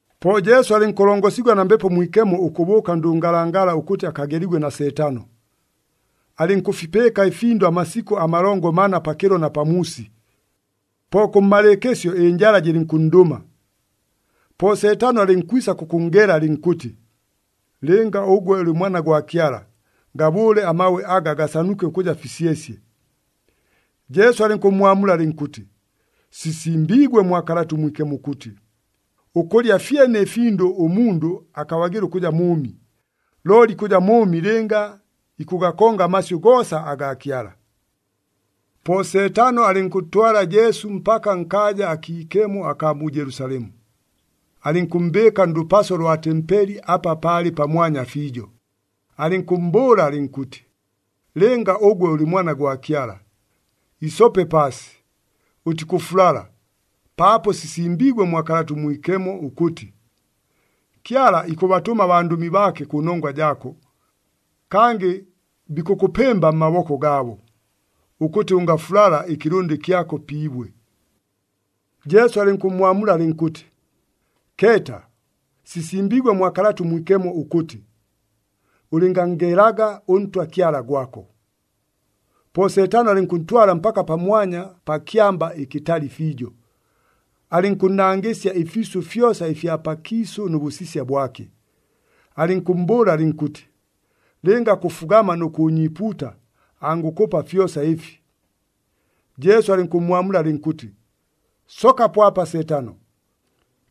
Po Jesu alɨnkʉlongosigwa na Mbepo Mwikemo ʉkʉbʉʉka ndʉngalangala ʉkʉtɨ akageligwe na Seetano. Alɨnkʉfipɨɨka ɨfindʉ amasikʉ amalongo mana pakɨlo na pamuusi. Po kʉmmalɨɨkɨsyo, ɨnjala jɨlɨnkʉnndʉma. Po Seetano alɨnkwisa kʉkʉnngela alɨnkʉtɨ, “Lɨnga ʉgwe ʉlɨ Mwana gwa Kyala, gabʉʉle amabwe aga gasanuke ʉkʉja fisyesye.” Jesu alɨnkʉmmwamula alɨnkʉtɨ, “Sisimbiigwe mwa Kalata ʉMwikemo ʉkʉtɨ, ‘Ʉkʉlya fyene ɨfindʉ ʉmundʉ akabagɨla ʉkʉja mʉʉmi, looli ikʉja mʉʉmi lɨnga ikʉgakonga amasyʉ goosa agaa Kyala.’” Po Seetano alɨnkʉntwala Jesu mpaka nkaaja akiikemo akaa mu Jelusalemu, alɨnkʉmmbɨɨka ndʉpaso lwa tempeli apa palɨ pamwanya fiijo, alɨnkʉmmbʉʉla alɨnkʉtɨ, “Lɨnga ʉgwe ʉlɨ Mwana gwa Kyala, isope paasi. Ʉtikʉfulala, paapo sisimbiigwe mwa Kalata ʉMwikemo ʉkʉtɨ, ‘Kyala ikʉbatʉma abandʉmi baake kʉnongwa jaako, kangɨ bikʉkʉpɨmba mmaboko gaabo, ʉkʉtɨ ʉngafulala ɨkɨlʉndɨ kyako pi ibwe.’” Jesu alɨnkʉmmwamula alɨnkʉtɨ, “Keeta, sisimbiigwe mwa Kalata ʉMwikemo ʉkʉtɨ, ‘Ʉlɨnganngelaga ʉNtwa Kyala gwako.’” Po Seetano alɨnkʉntwala mpaka pamwanya pa kyamba ɨkɨtali fiijo, alɨnkʉnnangɨsya ɨfiisʉ fyosa ɨfya pakiisʉ nʉ bʉsisya bwake, alɨnkʉmmbʉʉla alɨnkʉtɨ, “Lɨnga kʉfugama nʉ kʉʉnyiipuuta, angʉkʉpa fyosa ɨfi.” Jesu alɨnkʉmmwamula alɨnkʉtɨ, “Sookapo apa Seetano!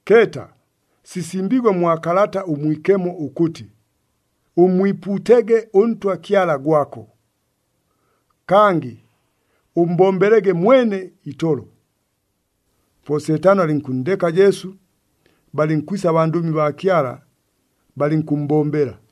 Keeta, sisimbiigwe mwa Kalata ʉMwikemo ʉkʉtɨ, ‘Ʉmmwipuutege ʉNtwa Kyala gwako. Kangɨ ʉmmbombelege mwene itolo.’” Po Seetano alɨnkʉnndeka Jesu, balɨnkwisa abandʉmi baa Kyala, balɨnkʉmmbombela.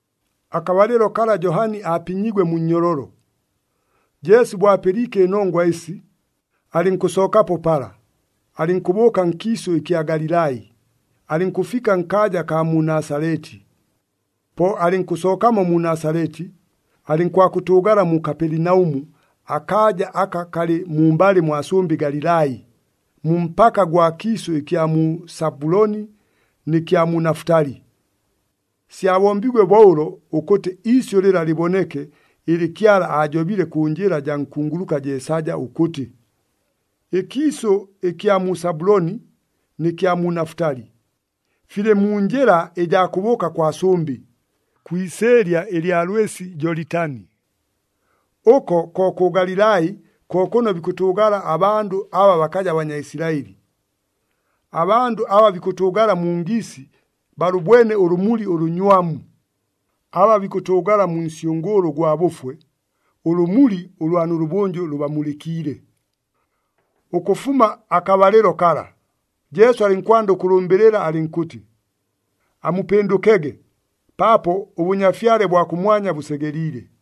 Akabalɨlo kala Johani aapinyiigwe mu nnyololo. Jesu bo apɨliike ɨnongwa ɨsi, alɨnkʉsookapo pala, alɨnkʉbʉʉka nkiisʉ ɨkya Galilai, alɨnkʉfika nkaaja akaa mu Nasaleti. Po alɨnkʉsookamo mu Nasaleti, alɨnkwakʉtʉʉgala mu Kapelinaʉmu, akaaja aka kalɨ mumbalɨ mwa sʉmbɨ Galilai, mu mpaka gwa kiisʉ ɨkya mu Sabuloni nɨ kya mu Nafutali. Syabombiigwe bo ʉlo ʉkʉtɨ iisyʉ lɨla lɨboneke ɨlɨ Kyala aajobile kʉ njɨla jaa nkunguluka Jeesaja ʉkʉtɨ, “Ɨkiisʉ ɨkya mu Sabuloni nɨ kya mu Nafutali, filɨ mu njɨla ɨjaa kʉbʉʉka kwa sʉmbɨ, kwi isɨɨlya ɨlya lwɨsi Jolitani. Ʉko kʉ Galilai ko kʉno bikʉtʉʉgala abandʉ aba bakaja Banyaisilaɨli. Abandʉ aba bikʉtʉʉgala mu ngiisi, balʉbwene ʉlʉmuli ʉlʉnywamu. Aba bikʉtʉʉgala mu nsyʉngʉʉlʉ ʉgwa bʉfwe, ʉlʉmuli ʉlwa nʉlʉbʉnjʉ lʉbamulɨkiile.” Ʉkʉfuma akabalɨlo kala, Jesu alɨnkwanda ʉkʉlʉmbɨlɨla alɨnkʉtɨ, “Amupɨndʉkege, paapo ʉBʉnyafyale bwa kʉmwanya bʉsegeliile.”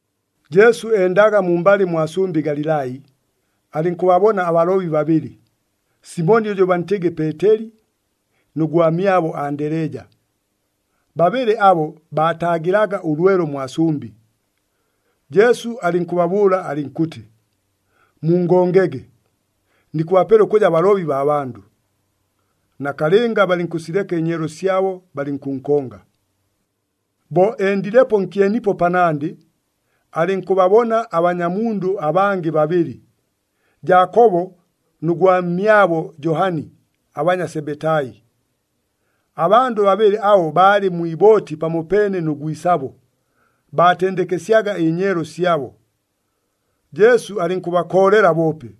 Jesu endaga mumbalɨ mwa sʉmbɨ Galilai, alɨnkʉbabona abalobi babɨlɨ, Simoni ʉjʉ bantɨgɨ Peeteli, nʉ gwamyabo Andeleja. Babɨlɨ abo baataagɨlaga ʉlwelo mwa sʉmbɨ. Jesu alɨnkʉbabʉʉla alɨnkʉtɨ, “Mungongege! Nikʉbapela ʉkʉja balobi baa bandʉ.” Nakalɨnga balɨnkʉsileka ɨnyeelo syabo, balɨnkʉnkonga. Bo endilepo nkyenipo panandɨ, alɨnkʉbabona abanyamundʉ abangɨ babɨlɨ, Jaakobo nʉ gwamyabo Johani, abanya Sebetai. Abandʉ babɨlɨ abo baalɨ mwi ibooti pamopeene nʉ gwisabo, baatendekesyaga ɨnyeelo syabo. Jesu alɨnkʉbakoolela boope.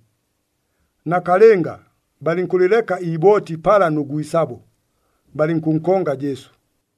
Nakalɨnga, balɨnkʉlɨleka iibooti pala nʉ gwisabo, balɨnkʉnkonga Jesu.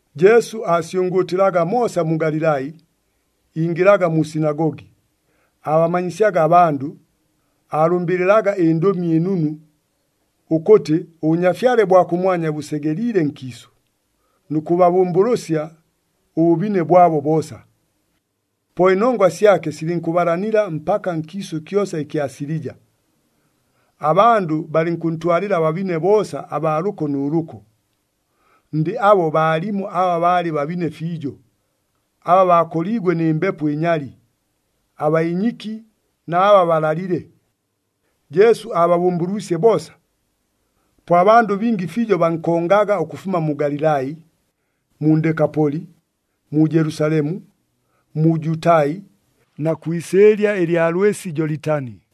Jesu aasyʉngʉʉtɨlaga moosa mu Galilai, ingɨlaga mu sinagogi, aabamanyisyaga abandʉ, aalʉmbɨlɨlaga ɨNdʉmi ɨNunu ʉkʉtɨ ʉBʉnyafyale bwa kʉmwanya bʉsegeliile nkiisʉ, nʉ kʉbabʉmbʉlʉsya ʉbʉbine bwabo boosa. Po ɨnongwa syake silɨnkʉbalanila mpaka nkiisʉ kyosa ɨkya Silija. Abandʉ balɨnkʉntwalɨla ababine boosa abaa lʉko nʉ lʉko. Ndɨ abo baalimo aba baalɨ babine fiijo, aba bakoliigwe nɨ mbepo ɨnyali, abaa inyiki na aba balalile. Jesu aababʉmbʉlwisye boosa. Po abandʉ bingi fiijo bankongaga ʉkʉfuma mu Galilai, mu Ndekapoli, mu Jelusalemu, mu Jutai na kwi isɨɨlya ɨlya lwɨsi Jolitani.